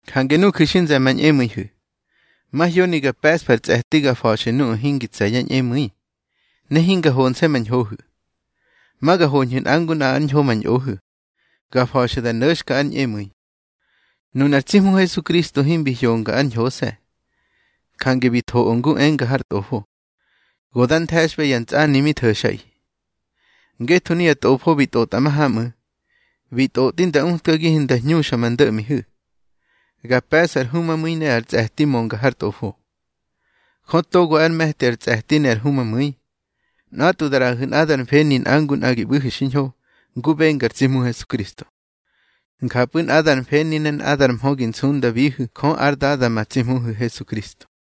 Jange nuju̱ xi nze̱di ma ñꞌemu̱ihu̱, mahyoni ga pe̱ꞌsfu̱ ar tsꞌe̱ti ga fa̱xu̱ nuꞌu̱ togo hingi tse̱ yá ñꞌemu̱i, ne hinga honse̱ ma ñhohu̱. Ma ga hoñhu̱ nꞌa ngu nꞌa ár ñho ma ñꞌohu̱, ga fa̱xu̱ da no̱xka ár ñꞌemu̱i. Nunar tsi Hmu Hesukristo himbi hyonga ár ñhose̱, jange bi thoꞌö ngu enga har Tꞌofo: Go da nthe̱xꞌbe ya ntsꞌani mi tho̱xꞌaꞌi. Ngetho nuya Tꞌofo bi tꞌotꞌa mahamꞌu̱, xi tꞌotꞌi nda utkagihu̱ nda hñuxa ma ndo̱ꞌmihu̱, ga pe̱ꞌsu̱ ar humamu̱i ne ar tsꞌe̱ti mönga har Tꞌofo. Jö togo ár me̱ti ar tsꞌe̱ti ne ar humamu̱i, nꞌatꞌwu̱ da ꞌraꞌahu̱ nꞌadar mfeni nꞌa ngu nꞌa gi ꞌbu̱hu̱ xiñho, ngu benga ar tsi Hmu Hesukristo. Njapꞌu̱ nꞌadar mfeni ne nꞌadar mhö gi nsundabihu̱ Jö ár Dada ma tsi Hmuhu̱ Hesukristo.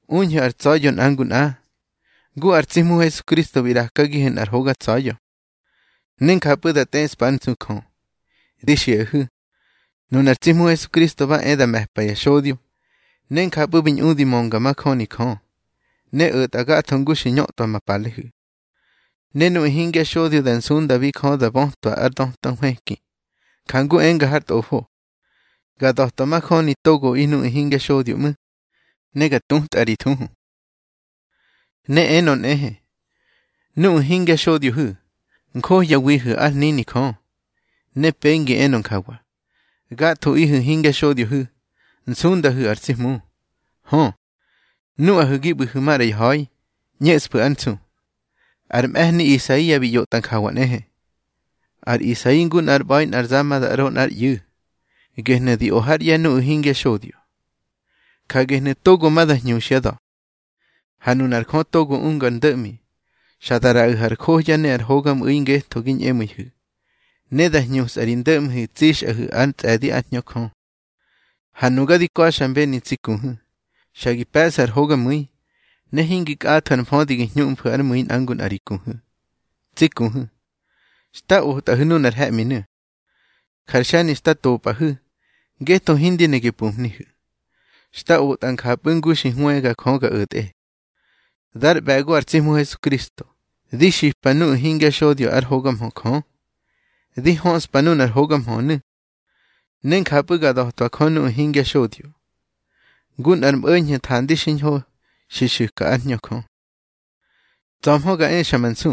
Uñhu̱ ar tsa̱ya̱ nꞌa ngu nꞌa, ngu ar tsi Hmu Hesukristo bi ꞌrakagihu̱ nꞌar hoga tsa̱ya̱, ne njapꞌu̱ da tꞌeꞌspa ár nsu Jö. Di xiꞌahu̱, nunar tsi Hmu Hesukristo ba e da me̱pa ya xodyo, ne njapꞌu̱ bi ñꞌudi mönga majöni Jö, ne o̱tꞌa gatho ngu xki ñötꞌwa ma palehu̱. Ne nuꞌu̱ hingya xodyo da nsundabi Jö da bötwa ár döta nhwëki, jangu enga har Tꞌofo: Ga da̱twa majöni togoꞌi nuꞌu̱ hingya xodyo ꞌmu̱, ne ga tútꞌa ri thuhu. Ne enö nꞌehe: Nuꞌahu̱ hingya xodyohu̱, njohyawihu̱ ár hnini Jö. Ne pengi enö njawa: Gathoꞌihu̱ hingya xodyohu̱, nsundahu̱ ar tsi Hmu. Hö, nuꞌahu̱ gi ꞌbu̱hu̱ maꞌra ya ha̱i, ꞌñeꞌsfu̱ ár nsu. Ar mꞌe̱hni Isaia bi ꞌyotꞌa njawa nꞌehe. Ar Isai ngu nꞌár ꞌba̱i nꞌar za ma da ꞌro nꞌár ꞌyu̱, gehnu̱ di o hár ꞌye̱ nuꞌu̱ hingya xodyo. Ja gehnu̱ togo ma da hñuxyá da̱. Ha nunar Jö togo unga ar ndo̱ꞌmi, xa da ꞌraꞌahu̱ ar johya ne ar hogamꞌu̱i ngetho gi ñꞌemu̱ihu̱. Ne da hñusꞌa ri ndo̱ꞌmihu̱ tsixꞌahu̱ ár tsꞌe̱di ár Hñö Jö. Ha nuga di ka̱xmbeni tsi kuhu̱, xa gi pe̱ꞌsu̱ ar hogamu̱i, ne hingi kꞌathu̱ ar mfödi gi hñuꞌmfu̱ ár mu̱i nꞌa ngu nꞌa ri kuhu̱. Tsi kuhu̱, xta otꞌahu̱ nunar he̱ꞌminu̱, jar xe̱ni xta topꞌahu̱, ngetho hindi ne gi pumhnihu̱. Xta otꞌa njapꞌu̱ ngu xi hwëga Jö ga o̱tꞌe. Dar ꞌbe̱go ar tsi Hmu Hesukristo, di xipa nuꞌu̱ hingya xodyo ár hoga mhö Jö. Di höꞌspa nunar hoga mhönu̱, ne njapꞌu̱ ga da̱twa Jö nuꞌu̱ hingya xodyo, ngu nꞌar mꞌo̱ñho̱ thandi xiñho xi xu̱ka ár Hñö Jö. Tsa̱hmö ga exa ma nsu,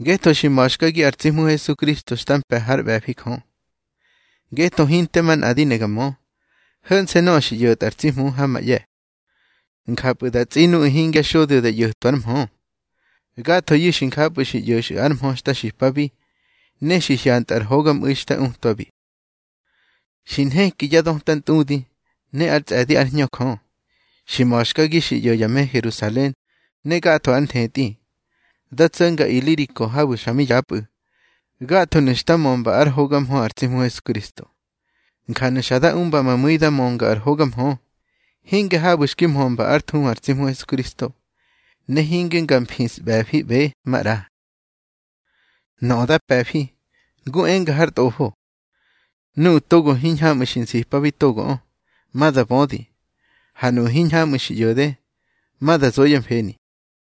ngetho xi ma̱xkagi ar tsi Hmu Hesukristo xta mpe̱ hár ꞌbe̱fi Jö. Ngetho hinte manꞌa di ne ga mö, ho̱nse̱ nöꞌö xi ꞌyo̱tꞌa ar tsi Hmu ha ma ꞌye̱, njapꞌu̱ da tsꞌi nuꞌu̱ hingya xodyo da ꞌyo̱twa ár mhö. Gathoyu̱ xi njapꞌu̱ xi ꞌyo̱xꞌu̱ ar mhö xta xipabi, ne xi hyantꞌu̱ ar hogamꞌu̱i xta utwabi. Xi nheki ya döta ntꞌudi, ne ár tsꞌe̱di ár Hñö Jö, xi ma̱xkagi xi ꞌyo̱ ya me Herusalen ne gatho ár nthetꞌi. Da tso̱nga Iliriko habu̱ xa mi yapꞌu̱, gathonu̱ xta mömba ár hoga mhö ar tsi Hmu Hesukristo. Njanu̱ xa da umba ma mu̱i da mönga ar hoga mhö, hinge habu̱ xki mhömba ár thuhu ar tsi Hmu Hesukristo, ne hinge nga mfisꞌbe̱fiꞌbe maꞌra. Nöꞌö da pe̱fi, ngu enga har Tꞌofo: Nuꞌu̱ togo hiñhamꞌu̱ xki nsipabi togoꞌö, ma da bödi. Ha nuꞌu̱ hiñhamꞌu̱ xi ꞌyo̱de, ma da zo yá mfeni.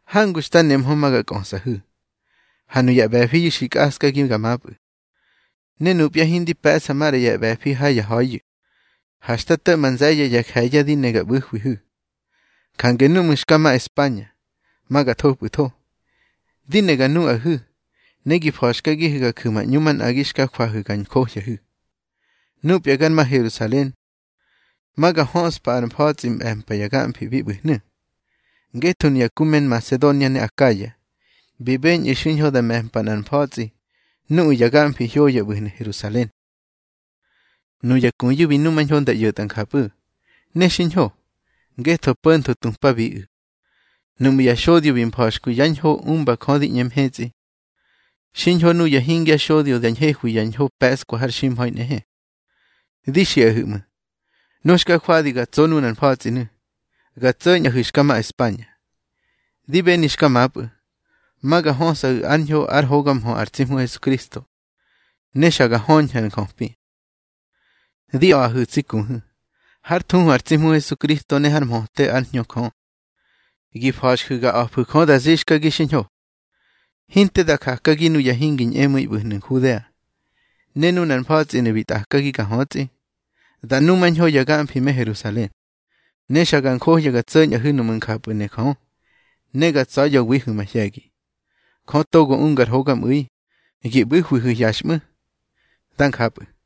Hangu xta nemhö ma ga kꞌösꞌahu̱, ha nuya ꞌbe̱fiyu̱ xi kꞌaskagi ga mapꞌu̱. Ne nupya hindi pe̱ꞌsa maꞌra ya ꞌbe̱fi ha ya ha̱iyu̱, ha xta to̱ꞌma nze̱ye̱ ya je̱ye̱ di ne ga ꞌbu̱hwihu̱. Jange núꞌmu̱ xka ma España, ma ga thopꞌu̱tho. Di ne ga nuꞌahu̱, ne gi fa̱xkagihu̱ ga ju̱ ma ꞌñu manꞌagi xka jwahu̱ ga njohyahu̱. Nupya gar ma Herusalen, ma ga höꞌspa ár mfa̱tsꞌi mꞌe̱mpa ya gamfi bi ꞌbu̱hnu̱. Ngetho nuya ku me Nmasedonia ne Akaya, bi beñꞌu̱ xiñho nda me̱mpa nꞌar mfa̱tsꞌi nuꞌu̱ ya gamfi hyoya ꞌbu̱hnu̱ Herusalen. Nuya kuyu̱ bi numañho nda ꞌyo̱tꞌa njapꞌu̱, ne xiñho, ngetho po̱ntho tupabiꞌu̱. Nuꞌmu̱ ya xodyo bi mfa̱xkwi yá ñho umba Jö di ꞌñe mhetsꞌi, xiñho nuya hingya xodyo da ñhehwi yá ñho pe̱ꞌskwa har ximha̱i nꞌehe. Di xiꞌaꞌihu̱ ꞌmu̱, nu xka jwadi ga tso nunar mfa̱tsꞌinu̱, ga tso̱ñꞌahu̱ xka ma España. Di beni xka mapꞌu̱, ma ga hösꞌahu̱ ár ñho ár hoga mhö ar tsi Hmu Hesukristo, ne xa ga höñhu̱ ar njöpi. Di a̱ꞌahu̱ tsi kuhu̱, hár thuhu ar tsi Hmu Hesukristo ne hár mhöte ár Hñö Jö, gi fa̱xju̱ ga a̱fu̱ Jö da zixkagi xiñho, hinte da jakagi nuya hingi ñꞌemu̱i ꞌbu̱hnu̱ Nhudea. Ne nunar mfa̱tsꞌinu̱ bi tꞌakagi ga hötsꞌi, da numañho ya gamfi me Herusalen. Ne xa ga njohya ga tso̱ñꞌahu̱ nuꞌmu̱ njapꞌu̱ ne Jö, ne ga tsa̱ya̱wihu̱ mahye̱gi. Jö togo unga ar hogamꞌu̱i, gi ꞌbu̱hwihu̱ hyaxꞌmu̱. Da njapꞌu̱.